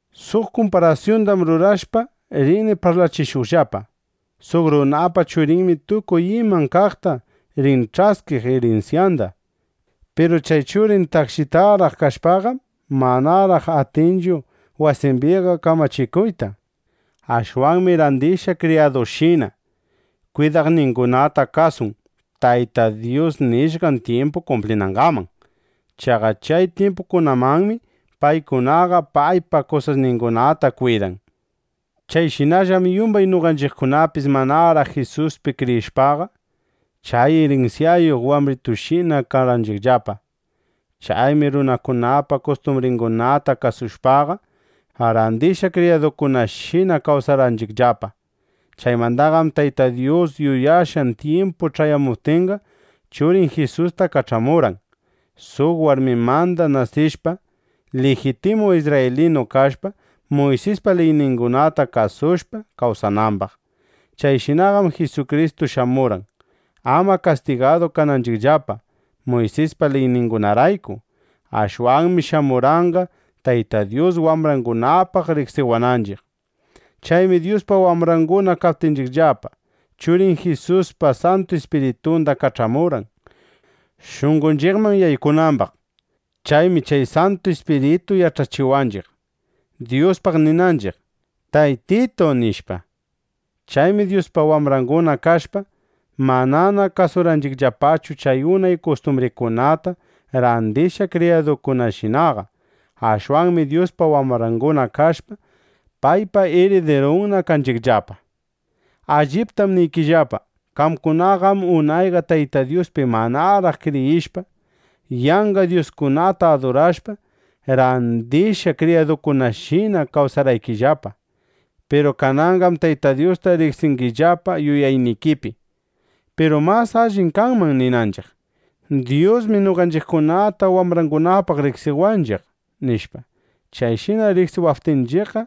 Suq kumparasyundam rurashpa, rini parlachishuqllapa: Suq runapa churinmi tukuy iman kaqta rin ch'askiq irinsyanda. Piru chay churin takshitaraq kashpaqam, manaraq atinchu wasimbiqa kamachikuyta. Ashwanmi randishqa kriyadushina kwidaqningunata kasun, taytan nishqan tyimpu kumplinangaman. Chaqa chay tyimpukamanmi, paykunaqa paypa kusasningunata kwidan. Chayshinallam yumbay noqanchiqkunapis manaraq Jisuspi kriyishpaqa, chay irinsyayuq wambritushina karqanchiqllapa. Chaymi runakunapa kustumbringunata kasushpaqa, randishqa kriyadukunashina kawsarqanchiqllapa. Chaymandaqam Tayta Dyus yuyashqan tyimpu ch'ayamuptinqa, Churin Jisusta kach'amurqan, suq warmimanda nasishpa, lijitimu isrraylinu kashpa, Muysispa liyningunata kasushpa, kawsanambaq. Chayshinaqam Jisukristu shamurqan, ama kastigadu kananchiqllapa Muysispa liyningunarayku. Ashwanmi shamurqanqa, Tayta Dyus wambrangunapaq riqsiwananchiq. Chaymi Dyuspa wambranguna kaptinchiqllapa, Churin Jisuspa Santu Ispiritunda kach'amurqan, shunqonchiqman yaykunambaq. Chaymi chay Santu Ispiritu yach'achiwanchiq, Dyuspaq ninanchiq: Taytitu, nishpa. Chaymi Dyuspa wambrangunana kashpa, manana kasunchiqllapachu chay unay kustumbrikunata, randishqa kriyadukunashinaqa. Ashwanmi Dyuspa wambrangunana kashpa, paypa iridirunna kanchiqllapa. Alliptam niykillapa, qamkunaqam unayqa Tayta Dyuspi manaraq kriyishpa, yanqa dyuskunata adurashpa, randishqa kriyadungunashina kawsarqaykillapa. Piru kananqam Tayta Dyusta riqsingillapa yuyaynikipi. Piru mas allim kanman ninanchiq: “Dyusmi noqanchiqkunata wambrangunapaq riqsiwanchiq”, nishpa. Chayshina riqsiwaptinchiqqa,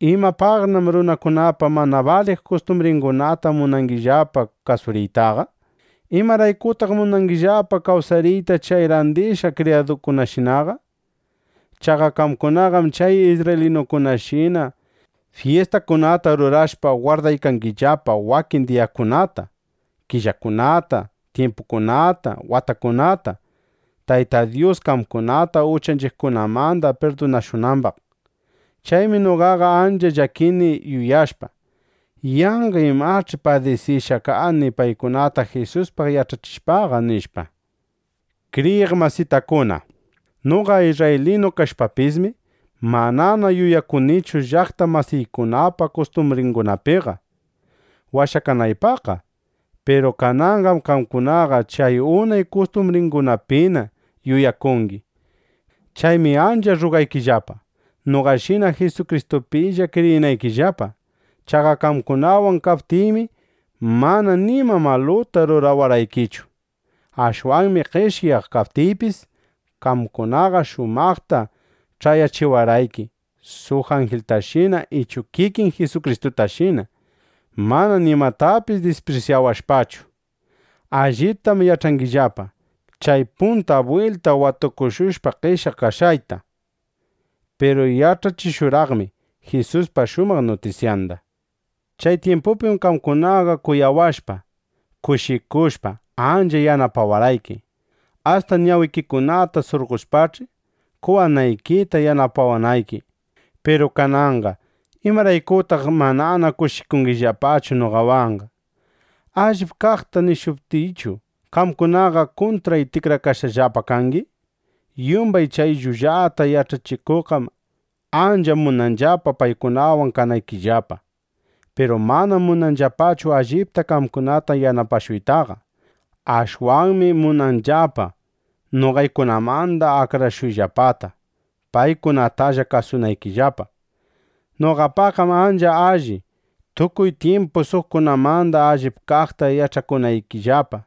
¿imapaqnam runakunapa mana baliq kustumbringunata munangillapa kasuriytaqa? ¿Imaraykutaq munangillapa kawsariyta chay randishqa kriyadushinaqa? Chaqa qamkunaqam chay isrraylinukunashina fyistakunata rurashpa, gwardaykangillapa wakin diyakunata, killakunata, tyimpukunata, watakunata, (Tayta Dyus qamkunata uchaykikunamanda pirdunashunambaq). Chaymi noqaqa ancha llakini yuyashpa: Yanqa imach'i padisishqa kani paykunata Jisuspaq yach'achishpaqa, nishpa. Kriyiq masitakuna, noqa isrraylinu kashpapismi, manana yuyakunichu llaqta masiykunapa kustumbringunapiqa, washakanaypaqqa. Piru kananqam qamkunaqa chay unay kustumbringunapina yuyakuykangi. Chaymi ancha rrugaykillapa, noqashina Jisukristupilla kriyinaykillapa. Chaqa qamkunawan kaptiymi, mana nima maluta rurawarqaykichu. Ashwanmi qeshyaq kaptiypis, qamkunaqa shumaqta ch'ayachiwarqayki suq anjiltashina ichu kikin Jisukristutashina, mana nimatapis disprisyawashpachu. Allitam yach'angillapa, chay punta bwilta watukushushpa qeshyaq kashqayta. Piru yach'achishurqaqmi Jisuspa shumaq nutisyanda. Chay tyimpupim qamkunaqa kuyawashpa, kushikushpa, ancha yanapawarqayki. Asta ñawikikunata surqoshpach'i, qowanaykita yanapawanayki. Piru kananqa ¿imaraykutaq manana kushikungillapachu noqawanqa? ¿Allip kaqta nishuptiychu, qamkunaqa kuntray tikrakashqallapa kangi? Yumbay chay llullata yach'achikuqqam ancha munanllapa paykunawan kanaykillapa. Piru manam munanllapachu allipta qamkunata yanapashuytaqa. Ashwanmi munanllapa noqaykunamanda akrashuyllapata, paykunatalla kasunaykillapa. Noqapaqqam ancha alli, tukuy tyimpu suqkunamanda allip kaqta yach'akunaykillapa.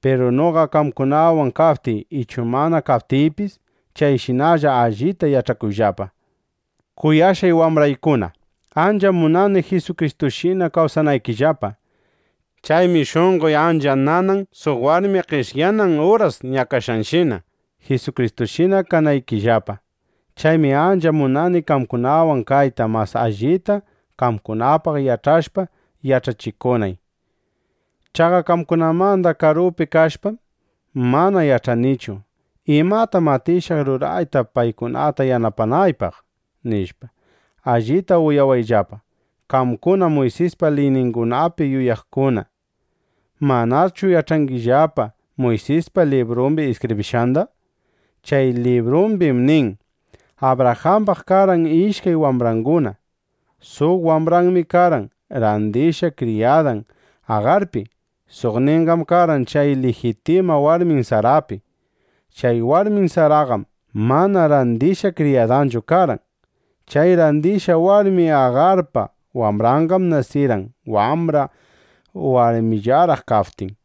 Piru noqa qamkunawan kaptiy ichu mana kaptiypis, chayshinalla allita yach'akuyllapa. Kuyashqay wambraykuna, ancham munani Jisukristushina kawsanaykillapa. Chaymi shunqoy ancha nanan suq warmi qeshyanan uras ñakashqanshina, Jisukristushina kanaykillapa. Chaymi ancha munani qamkunawan kayta, mas allita qamkunapaq yach'ashpa yach'achishunay. Chaqa qamkunamanda karupi kashpam, mana yach'anichu: ¿Imatam atishaq rurayta, paykunata yanapanaypaq? nishpa. Allita uyawayllapa, qamkuna Muysispa liyningunapi yuyakuqkuna. ¿Manachu yach'angillapa Muysisqa librumbi iskibrishqanda? Chay librumbim nin: Abrajambam karqan ishkay wambranguna. Suq wambranmi karqan randishqa kriyadan Agarpi. Suqninqam karqan chay lijitima warmin Sarapi. Chay warmin Saraqam mana randishqa kriyadanchu karqan. Chay randishqa warmi Agarpa wambranqam nasirqan wambra warmillaraq kaptin.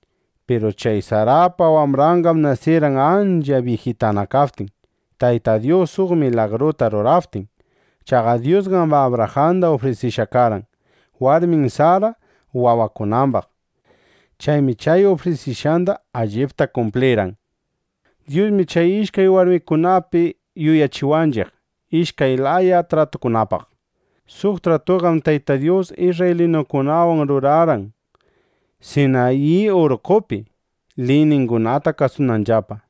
Piru chay Sarapa wambranqam nasirqan ancha byijitana kaptin, Tayta Dyus suq milagruta ruraptin. Chaqa Dyusqam Abrajanda ufrisishqa karqan, warmin Sara wawakunambaq. Chaymi chay ufrisishqanda allipta kumplirqan. Dyusmi chay ishkay warmikunapi yuyachiwanchiq ishkay laya tratukunapaq. Suq tratutaqam Tayta Dyus isrraylinukunawan rurarqan Sinayi urqqopi, liyningunata kasunanllapa.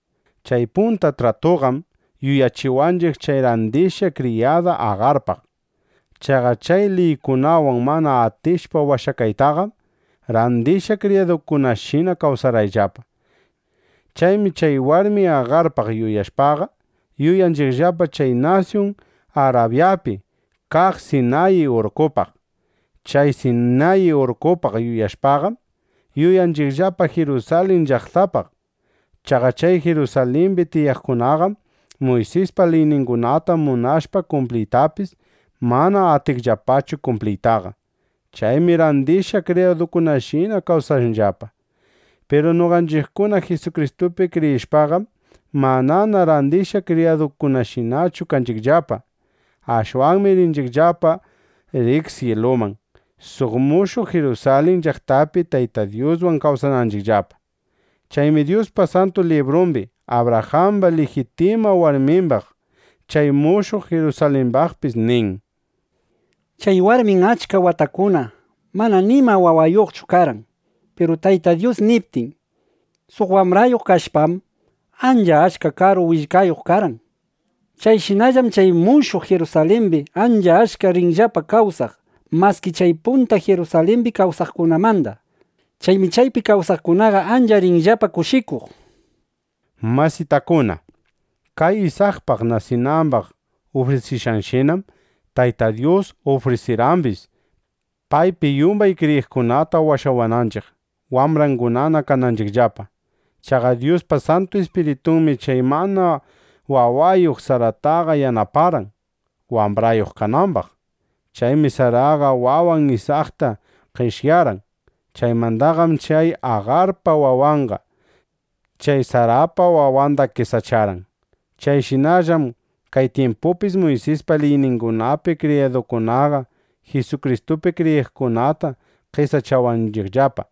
Chay punta tratuqam yuyachiwanchiq chay randishqa kriyada Agarpaq. (Chaqa chay liykunawan mana atishpa washakaytaqam, randishqa kriyadukunashina kawsarqayllapa.) Chaymi chay warmi Agarpaq yuyashpaqa, yuyanchiqllapa chay nasyun Arabyapi kaq Sinayi urqqopaq. Chay Sinayi urqqopaq yuyashpaqam, yuyanchiqllapa Jirusalin llaqtapaq. Chaqa chay Jirusalimbi tiyaqkunaqam Muysispa liyningunata munashpa kumpliytapis, mana atinllapachu kumpliytaqa. Chaymi randishqa kriyadukunashina kawsanllapa. Piru noqanchiqkuna Jisukristupi kriyishpaqam, manana randishqa kriyadushinachu kanchiqllapa. Ashwanmi rinchiqllapa riq syiluman, suq mushuq Jirusalin llaqtapi Tayta Dyuswan kawsananchiqllapa. Chaymi Dyuspa Santu Librumbi Abrajamba lijitima warmimbaq, chay mushuq Jirusalimbaqpis nin: Chay warmim achka watakunata mana nima wawayuqchu karqan. Piru Tayta Dyus niptin, suq wambrayuq kashpam, ancha achka karu willkayuq karqan. Chayshinallam chay mushuq Jirusalimbi ancha achka rinllapa kawsaq, maski chay punta Jirusalimbi kawsaqkunamanda. Chaymi chaypi kawsaqkunaqa ancha rinllapa kushikuq, nishpa. Masitakuna, chay Isakpaq nasinambaq ufrisishqanshinam, Tayta Dyus ufrisirqambis, paypi yumbay kriyiqkunata washawananchiq, wambrangunana kananchiqllapa. Chaqa Dyuspa Santu Ispiritunmi chay mana wawayuq Sarataqa yanaparqan, wambrayuq kanambaq. Chaymi Saraqa wawan Isakta qeshyarqan. Chaymandaqam chay Agarpa wawanqa chay Sarapa wawanda qesacharqan. Chayshinallam kay tyimpupipis Muysispa liyningunapi kriyiqkunaqa Jisukristupi kriyiqkunata qesachawanchiqllapa.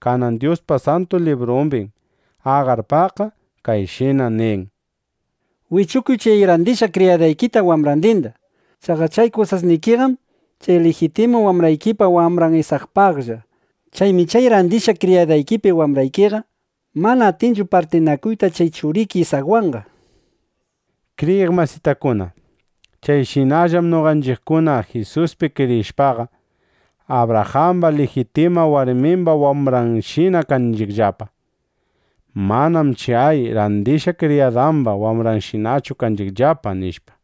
Kanan Dyuspa Santu Librumbim Agarpaqqa kayshina nirqan: “Wichukuy chay randishqa kriyadaykita wambrandinda. Chaqa chay kusasnikiqam chay lijitima warmikipa wambran Isakpaqlla. Chaymi chay randishqa kriyadaykipi wambraykiqa mana atinchu partinakuyta chay churiki Isakwanqa”, nishpa. Kriyiq masitakuna, chayshinallam noqanchiqkuna Jisuspi kriyishpaqa, Abrajamba lijitima warmimba wambranshina kanchiqllapa. Manam chay randishqa kriyadamba wambranshinachu kanchiqllapaqa, nishpa.